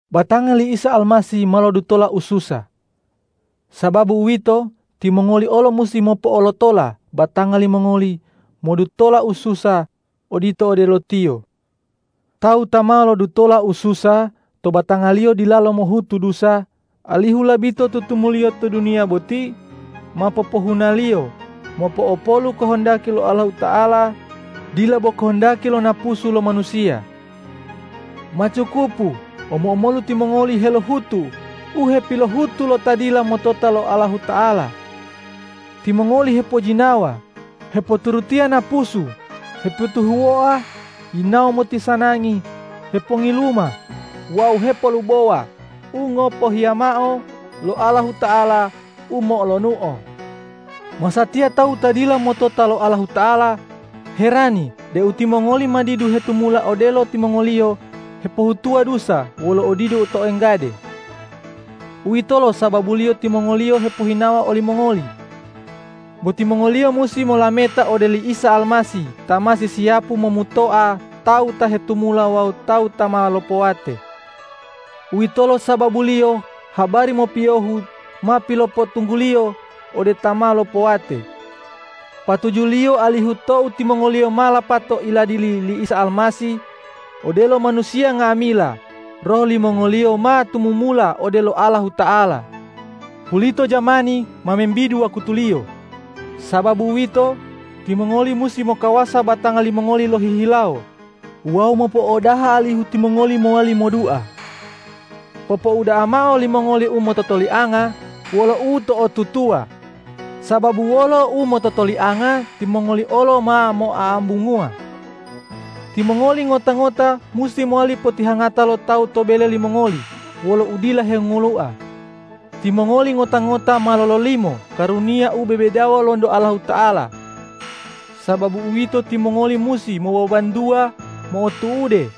Batanga li Isa Almasih ma lodutola ususa. Sababu uwito, timongoli olo musi mopo'olotola batanga limongoli modutola ususa odito odelo Tiyo. Tawu ta ma lodutola ususa to batangaliyo dilalo mohutu dusa, alihu labito tutumuliyo to duniya boti ma popohunaliyo mopo'opolu kohondaki lo Allahuta'ala, dila bo kohondaki lo napusu lo manusiya. Ma cukupu omo-omolu timongoli helohutu u hepilohutu lo ta dila motota lo Allahuta'ala. Timongoli hepojinawa, hepoturutiya napusu, hepotihuwoa, yinawo motisanangi, hepongiluma wawu hepolubowa u ngopohiya mao lo Allahuta'ala u mo'olonuo. Masatiya tawu ta dila motota lo Allahuta'ala herani deu timongoli ma didu hetumula odelo timongoliyo, hepohutuwa dusa wolo udidu toenggade. Uwitolo sababuliyo timongoliyo hepohinawa olimongoli. Bo timongoliyo musi molameta ode oli Isa Almasih ta ma sisiyapu momutoa tawu ta hetumula wawu tawu ta ma lopowate. Uwitolo sababuliyo habari mopiyohu ma pilopotunggu-Liyo ode ta ma lopowate. Patujuliyo alihu tou timongoliyo ma lapato iladili li Isa Almasih odelo manusiya nga'amila, roh limongoliyo ma tumumula odelo Allahuta'ala. Pulito jamani ma membidu wakutuliyo. Sababu uwito, timongoli musi mokawasa batanga limongoli lohihilawo wawu mopo'odaha alihu timongoli mowali modua. Popouda'a mao limongoli u mototolianga wolo uto'otutuwa, sababu wolo umototolianga timongoli olo ma moa'ambunguwa. Timongoli ngota-ngota musi mowali potihangata lo tawu to bele limongoli wolo udila hengulua. Timongoli ngota-ngota ma lololimo karuniya u bebedawa lonto Allahuta'ala. Sababu uwito, timongoli musi mobabantuwa motu'ude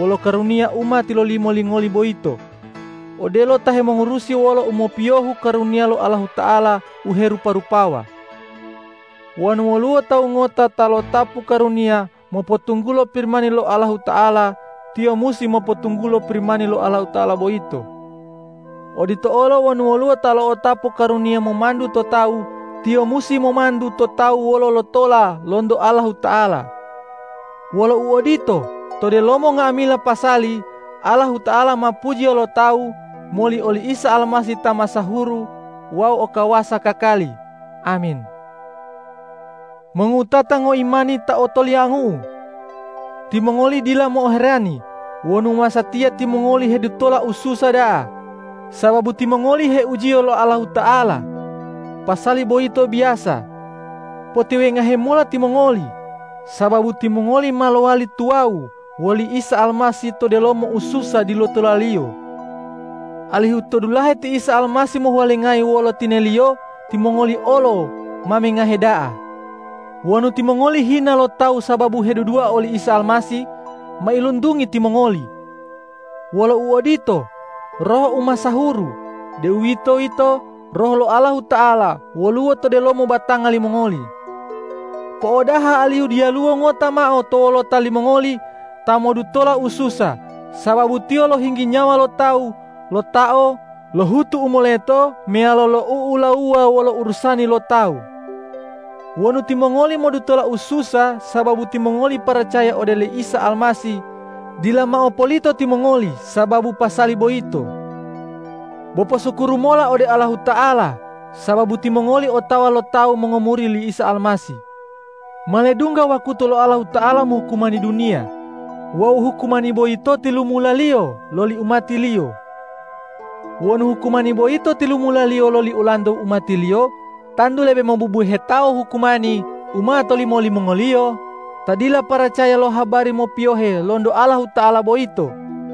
wolo karuniya u ma tilolimo limongoli boyito, odelo ta hemongurusi wolo umopiyohu karuniya lo Allahuta'ala u herupa-rupawa. Wonu woluwo tawu ngota ta lo'otapu karuniya mopotunggulo Pirimani lo Allahuta'ala, tiyo musi mopotunggulo Pirimani lo Allahuta'ala boyito. Odito olo wonu woluwo ta lo'otapu karuniya momantu to tawu, tiyo musi momantu to tawu wolo lotola lonto Allahuta'ala. Wolo uodito, to delomo nga'amila pasali Allahuta'ala ma pujiyo lo tawu moli oli Isa Almasih ta masahuru wawu o kawasa kakali. Amin. Mongowutata ngoimani ta otoliangu'u! Timongoli dila mao herani wonu masatiya timongoli hedutola ususa da'a, sababu timongoli heujiyo lo Allahuta'ala. Pasali boyito biyasa. Potiwengahe mola timongoli sababu timongoli ma lowali tuwawu woli Isa Almasih to delomo ususa dilutola-Liyo, alihu to dulahe ti Isa Almasih mohuwalingayi wolo tine-Liyo, timongoli olo ma mengahe da'a. Wonu timongoli hina lo tawu sababu hedudua oli Isa Almasih, mailuntungi timongoli. Wolo uodito, Roh umasahuru, deuwitoyito Roh lo Allahuta'ala, woluwo to delomo batanga limongoli. Po'odaha alihu diyaluwo ngota mao to wolota limongoli ta modutola ususa sababu tiyo lohinggi nyawa lo tawu, lotao, lohutu u moleto meyalo lou'ulawuwa wolo urusani lo tawu. Wonu timongoli modutola ususa sababu timongoli paracaya ode oli Isa Almasih, dila mao polito timongoli sababu pasali boyito. Bo posukuru mola ode Allahuta'ala, sababu timongoli otawa lo tawu mongomuri li Isa Almasih. Ma ledungga wakutu lo Allahuta'ala mohukumani duniya wawu hukumani boyito tilumula-Liyo loli umati-Liyo. Wonu hukumani boyito tilumula-Liyo loli olanto umati-Liyo, tantu lebe mobubuhetao hukumani u ma tolimo limongoliyo ta dila paracaya lo habari mopiyohe lonto Allahuta'ala boyito.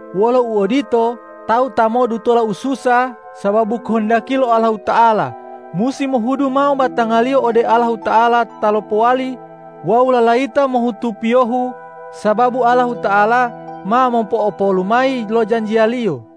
Wolo uodito, tawu ta modutola ususa sababu kohondaki lo Allahuta'ala, musi mohudu mao batangaliyo ode Allahuta'ala ta lopowali wawu lalayita mohutu piyohu, sababu Allahuta'ala ma mopo'opolu mayi lo janjiya-Liyo.